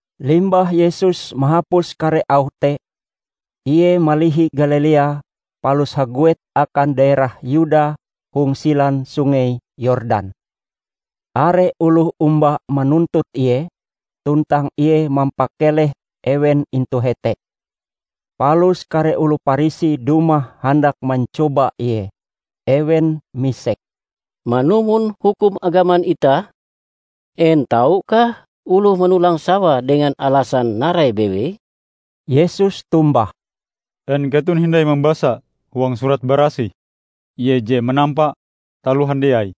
Limbah Yesus mahapus kare auh te, Ie malihi Galilea palus haguet akan daerah Yuda hong silan Sungei Yordan. Are oloh omba manuntut Ie, tuntang Ie mampakeleh ewen intu hete. Palus kare oloh Parisi dumah handak mancoba Ie. Ewen misek, "Manumon hukum agaman itah, en taukah oloh manolang sawae dengan alasan narai bewei?" Yesus tombah, "En keton hindai mambasa huang Surat Barasih, Ie je manampa taloh handiai,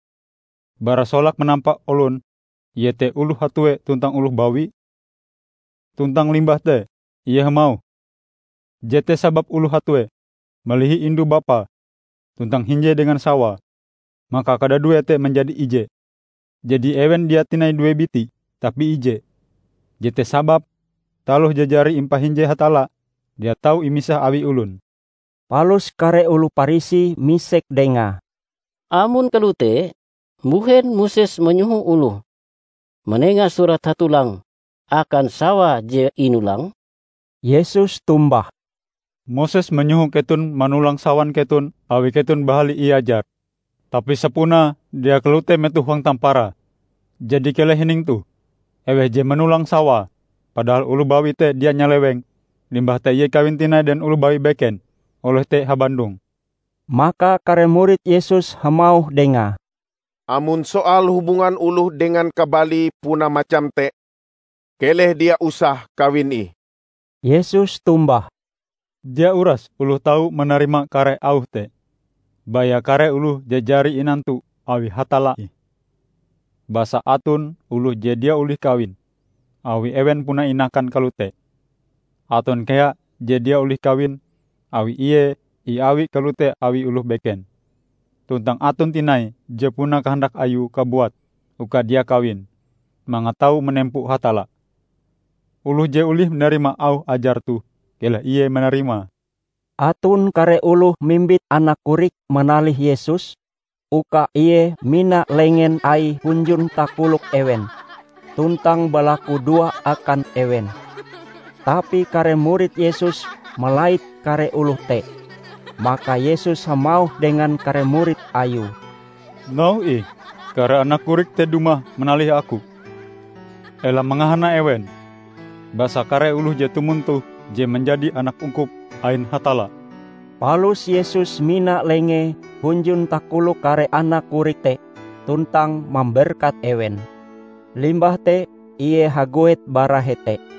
bara solake manampa olon iete oloh hatue tuntang oloh bawi? Tuntang limbah te Ie hamauh, 'Jete sababe oloh hatue malihi indu-bapae tuntang hinje dengan sawae maka kadaduee te manjadi ije.' Jadi ewen dia tinai due biti, tapi ije. Jete sababe taloh je jari impahinje Hatalla dia tau imisah awi olon." Palus kare oloh Parisi misek Dengae, "Amon kalote mbuhen Moses manyoho oloh manenga surat hatolang akan sawae je inolange?" Yesus tombah, "Moses manyoho keton manolang sawan keton awi keton bahali iajar. Tapi sapunae dia kalote metoh hong tamparae. Jadi keleh hining toh: Eweh je manolang sawae -- padahal oloh bawi te dia nyaleweng -- limbah te ie kawin tinai dengan oloh bawi beken, oloh te habandong." Maka kare murid Yesus hamauh Dengae, "Amon soal hubungan oloh dengan kabalie puna macam te, keleh dia usah kawin ih." Yesus tombah, "Dia uras oloh tau manarima kare auh te, baya kare oloh je jari inantu awi Hatalla ih. Basa aton oloh je dia olih kawin, awi ewen puna inakan kalote. Aton kea je dia olih kawin awi ie iawi kalote awi oloh beken. Tuntang aton tinai je puna kahandak ayue kabuat uka dia kawin, mangat tau manempo Hatalla. Oloh je olih manarima auh ajar toh, keleh ie manarimae." Aton kare oloh mimbit anak korik manalih Yesus uka Ie mina lengen Aie hunjun takolok ewen tuntang balaku doa akan ewen. Tapi kare murid Yesus malait kare oloh te. Maka Yesus hamauh dengan kare murid Ayue, "Nauhe ih kare anak korik te dumah manalih Aku! Ela mangahana ewen, basa kare oloh je tumon toh je manjadi anak ungkup ain Hatalla." Palus Yesus mina Lengee hunjun takolok kare anak korik te tuntang mamberkat ewen. Limbah te Ie haguet bara hete.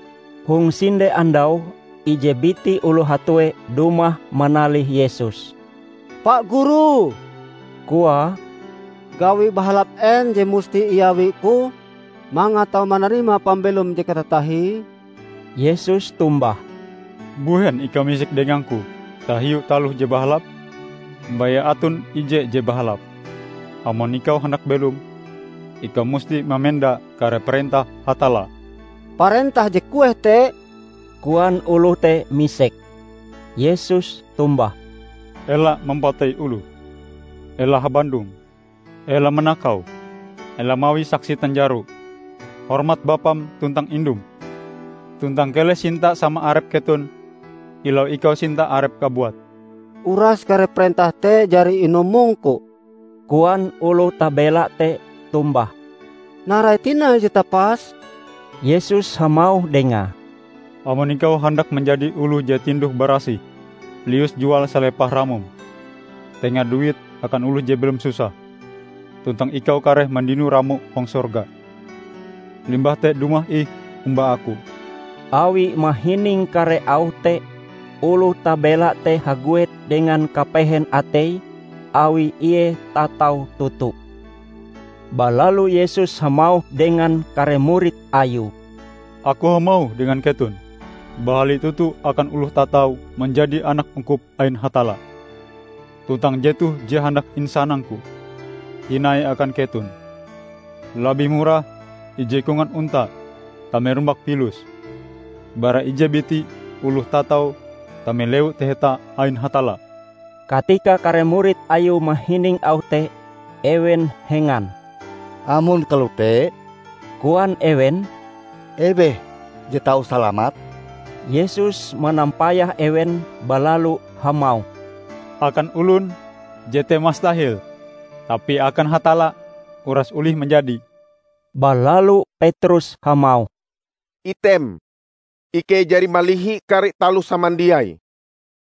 Hong sinde andau ije biti oloh hatue dumah manalih Yesus. "Pa Guru," koae, "gawi bahalap en je musti iawiku mangat tau manarima pambelom je katatahie?" Yesus tombah, "Mbuhen ikau misek dengang-Ku tahiu taloh je bahalap? Baya aton Ije je bahalap. Amon ikau handak belom, ikau musti mamenda kare parentah Hatalla." "Parentah je kueh te?" koan oloh te misek. Yesus tombah, "Ela mampatei oloh, ela habandong, ela manakau, ela mawi saksi tanjaro, hormat bapam tuntang indum; tuntang keleh sinta sama arep keton kilau ikau sinta arepm kabuat." "Uras kare parentah te jari inumongku," koan oloh tabela te tombah. "Narai tinai je tapas?" Yesus hamauh dengae, "Amon ikau handak manjadi oloh je tinduh barasih, lius jual salepah ramom. Tenga duite akan oloh je belom susah, tuntang ikau kareh mandino ramo hong sorga. Limbah te dumah ih omba Aku!" Awi mahining kare auh te, oloh tabela te haguet dengan kapehen ateie awi ie tatau toto. Balalu Yesus hamauh dengan kare murid Ayue, "Aku hamauh dengan keton, bahali toto akan oloh tatau manjadi anak ungkup ain Hatalla. Tuntang jetoh je handak insanang-Ku tinai akan keton; labih murah ije kongan onta tame rumbak pilus, bara ije biti oloh tatau tame Lewu Taheta ain Hatalla." Katika kare murid Ayue mahining auh te, ewen hengan. "Amon kalote," koan ewen, "eweh je tau salamat?" Yesus manampayah ewen balalu hamauh, "Akan olon jete mastahel! Tapi akan Hatalla, uras olih manjadi." Balalu Petrus hamauh, "Item ikei jari malihi kare taloh samandiai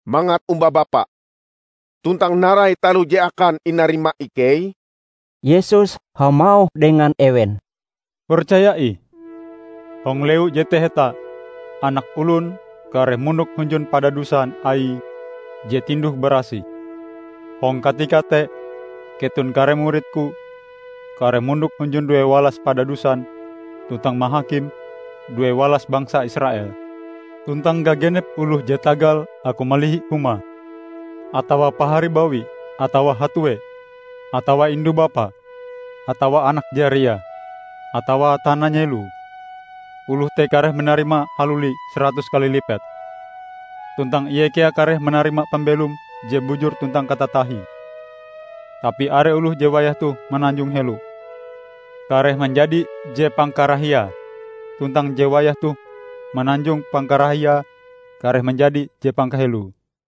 mangat omba Bapa. Tuntang narai taloh je akan inarima ikei?" Yesus hamauh dengan ewen, "Percaya ih: Hong Lewu je Taheta, Anak Olon kareh mondok hunjun padadusan Aie je tinduh barasih. Hong katika te keton kare murid-Ku kareh mondok hunjun due walas padadusan tuntang mahakim due walas bangsa Israel! Tuntang gagenep oloh je tagal Aku malihi humae, atawa paharie bawi atawa hatue, atawa indu-bapae, atawa anak jariae, atawa tana nyeloe, oloh te kareh manarima haluli saratus kali lipet. Tuntang ie kea kareh manarima pambelom je bujur tuntang katatahie. Tapi are oloh je wayah toh mananjong helo, kareh manjadi je pangkarahiae tuntang je wayah toh mananjong pangkarahiae kareh manjadi je pangkaheloe."